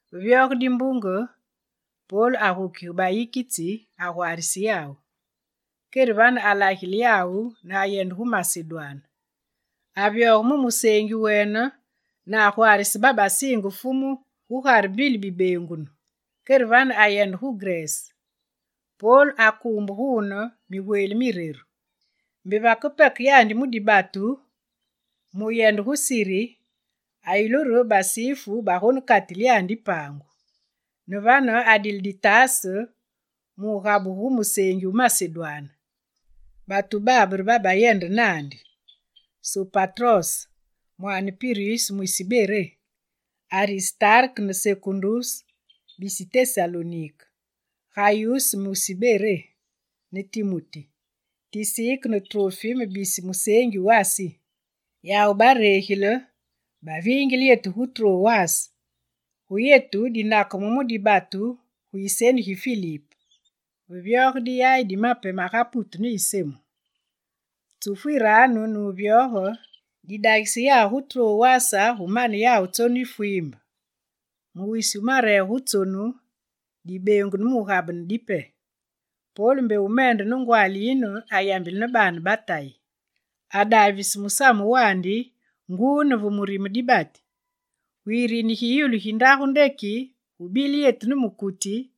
Ve vyoge dimbunge, Pol agukige bayikitsi, agwaarise yawu. Kere vane alagile yawu ne ayende gu Masedwane. Avyoge mu museengi wene ne agwaarise babasiinge Fumu gugare mbili bibeengunu. Kere vane ayende gu Grese. Pol akuumbe guune migweli mireru. Mbe vake peke Pol mu dibatu mu wuyende gu Siri, ayulu re basifu bagonekatile yandi paangu. Ne vane adile ditaase diwugabugu gu museengi wu Masedwane. Batu babe re babayende naandi: Sopatros, mwaane Piruse mwisi Beré, Aristarke ne Sekunduse, bisi Tesalonike, Gayuse, mwisi Derbé, ne Timuti, Tisike ne Trofime bisi museengi wu Asi. Yawu baregile, baviingile yetu gu Trowas. Gu yetu, dinakeme mu dibatu gu yiseni gi Filip, ve vyoge diyayi di mape maga putu ne yisemu. Tsufu yiraanu ne wuvyoge, didagise yawu gu Trowas gu mane yetu tsonu yi fwiimbe. Mu wisi wu mareege wu tsonu, dibeengunu mu wugabene dipe. Pol mbe wumende ne ngwaali yine ayambile ne baane ba Tayi. Adaavise musamu wandi nguu ne ve murime dibati. Gu yirini gi yulu gi ndagu ndeki gubile yetu ne mukuti,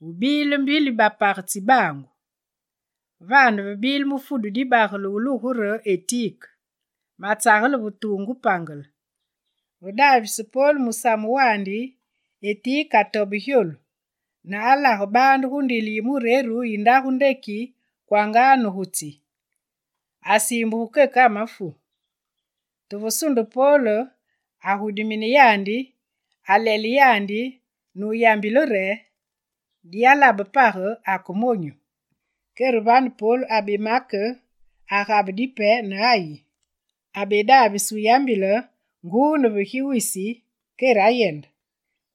gubile mbili bapage tsibaangu. Vane ve bile mufudu dibagele wulugungu re Etike, matsagele ve tuungu pangele. Ve daavise Pol musamu wandi, Etike atobe gyolu, ne alage baande gu ndilu yi mureru yi ndagu ndeki kwanga ne gu tsi. Asiimbulu keke amafu. Te ve sunde Pol, agudimine yandi, alele yandi ne wuyambile re: «Diyalabe page, ake monyu!» Kere vane Pol abemake, agabe dipe ne ayi. Abedaavise wuyambile nguu ne ve gi wisi, kere ayende.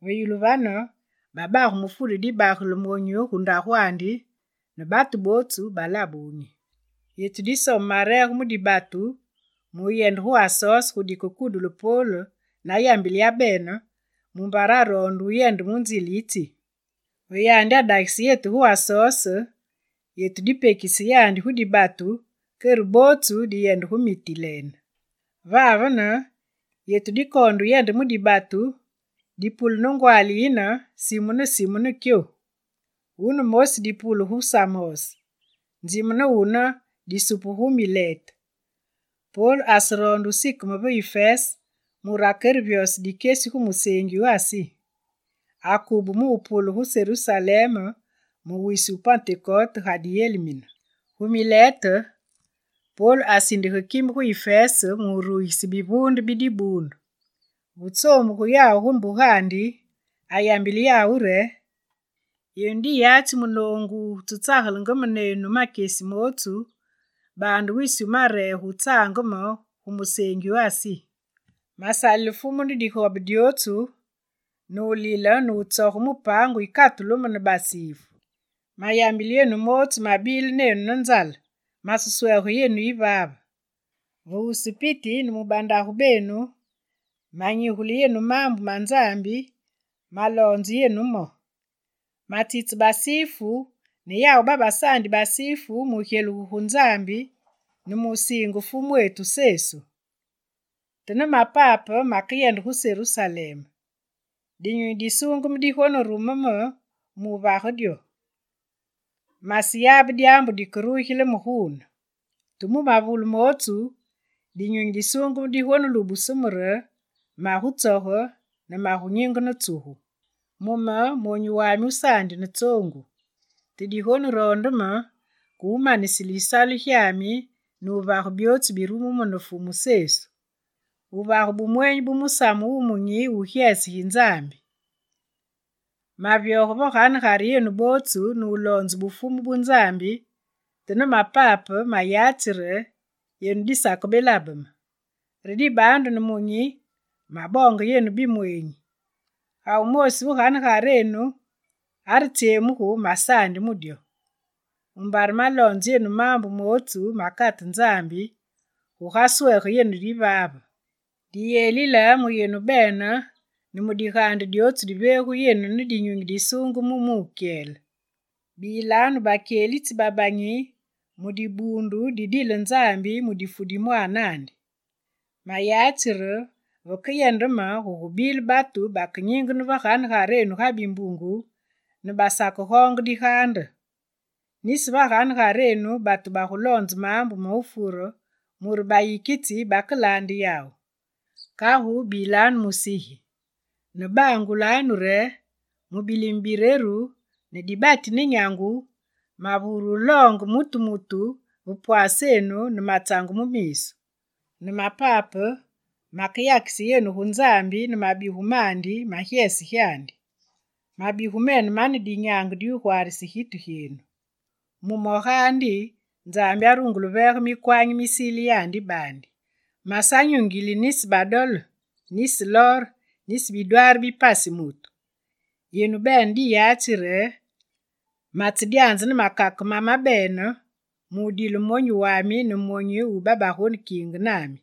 Ve yulu vane, babage mufudu dibagele monyu gu ndagwandi ne batu bootsu balabe wunyi. Yetu disome mareege mu dibatu mu wuyende gu Asos gu dikekudule Pol, nayambile yabene, mumbare aroonde wuyende mu nzile yi tsi. Ve yandi adagise yetu gu Asos, yetu dipekise yandi gu dibatu kere bootsu diyende gu Mitilene. Vavene yetu dikoonde wuyende mu dibatu, dipule ne ngwaali yine, simu ne simu ne Kyo. Wune mosi dipule gu Samos, nzime ne wune disupugu gu Milete. Pol aseroonde wusikeme ve Ifese, mure akerevyose dikyesi gu museengi wu Asi. Akube mu wupule gu Serusalem mu wisi wu Pentekote, ga diyelimine. Gu Milete, Pol asindige kime gu Ifese mu wurugise bivuunde bi dibuundu. Ve tsoombugu yawu gu mbugandi, ayambile yawu re: «Yenu diyatsi munoongu wutsetsagelenge me nenu makyesi mootsu, baande wisi wumareege wutsaange me gu museengi wu Asi. Masalile Fumu ne digobe dyootsu, ne wulile ne wutsoge mu paangu yikatulu me ne basifu. Mayambile yenu mootsu mabile nenu ne nzale, maseswege yenu yivaave. Ve wusu piti ne mu bandagu benu, manyigule yenu maambu ma Nzambi, maloonze yenu mo. Matsitse basifu ne yawu babasaandi basifu mu wugyelugu gu Nzambi ne mu wusiinge Fumwetu Sesu. Te ne mamape, makeyende gu Serusalem. Dinyunyi Disuungeme digonerume me mu wuvage dyo. Maseyabe dyaambu dikerugile me guune. Te mu mavule mootsu, Dinyunyi Disuungeme digonelubuse me re magutsoge ne magunyingene tsugu. Mu me, monyu wami wusaandi ne tsoongu. Te digoneroonde me ke wumanisile yisalu gyami ne wuvage byootsu birumu me ne Fumu Sesu: wuvage bumweenyi bu Musamu Wumunyi wu gyese gi Nzambi. Mavyoge va ganegarenu bootsu ne wuloonze Bufumu bu Nzambi, te ne mapape, mayatsi re yenu disakebelabe me. Re dibaandu, nemunyi maboonge yenu bimweenyi: Ga wumoosi ve ganegarenu aretsyemugu, masaandi mu dyo. Mumbare maloonze yenu maambu mootsu makate Nzambi, gugaswege yenu yivaave. Diyelile mu yenu bene ne mu digaande dyootsu diveegu yenu ne Dinyunyi Disuungeme mu wukyele. Bilanu bakyelitsi babanyi mu Dibuundu didile Nzambi mu difu di mwaanandi. Mayatsi re, vakeyende me, gugubile batu bakenyingene veganegarenu ga bimbungu ne basakegoonge digaande. Nisi ve ganegarenu, batu baguloonzenge maambu ma wufure mure bayikitsi bakelaande yawu. Kagu bilanu musigi! Ne bangulanu re: mu bilime bireru, ne dibati ne nyangu, mavure wuloonge mutu mutu va pwaasenu ne matsange mu miisu. Ne mapape, makeyakise yenu gu Nzambi ne mu mabigu mandi ma gyese gyandi. Mabigu mene mane dinyaange diwugwaarise gitu gyenu. Mu mo gaandi, Nzambi arungule wuveege mikwanyi misile yandi baandi. Masanyungile nisi badole, nisi lor, nisi bidwaari bi pasi mutu. Yenu bene diyatsi re matsedyanze ne makake mamabene mu wudile monyu wami ne myonyu mi babagonekiinge nami.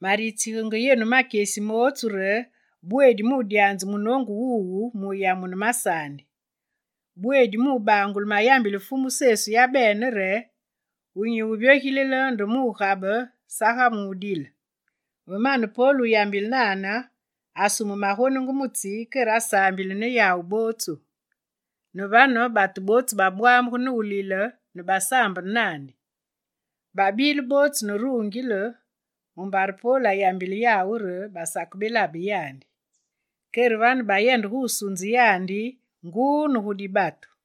Maritsigenge yenu makyesi mootsu re bweedi mudyanze munoongu wuwu, mu wuyamune masaandi. Bweedi mu wubangule mayambile Fumu Sesu yabene re: “Wunyi wuvyogilile nde mu wugabe saga mu wudile.”» Ve mane Pol wuyambile nane, asume magonungu mu tsi kere asaambile ne yawu bootsu. Ne vane, batu bootsu babwamugu ne wulile ne basaambene naandi. Babile bootsu ne rungile mumbare Pol ayambile yawu re basakebelabe yandi. Kere vane bayende gu wusunze yandi nguu ne gu dibatu.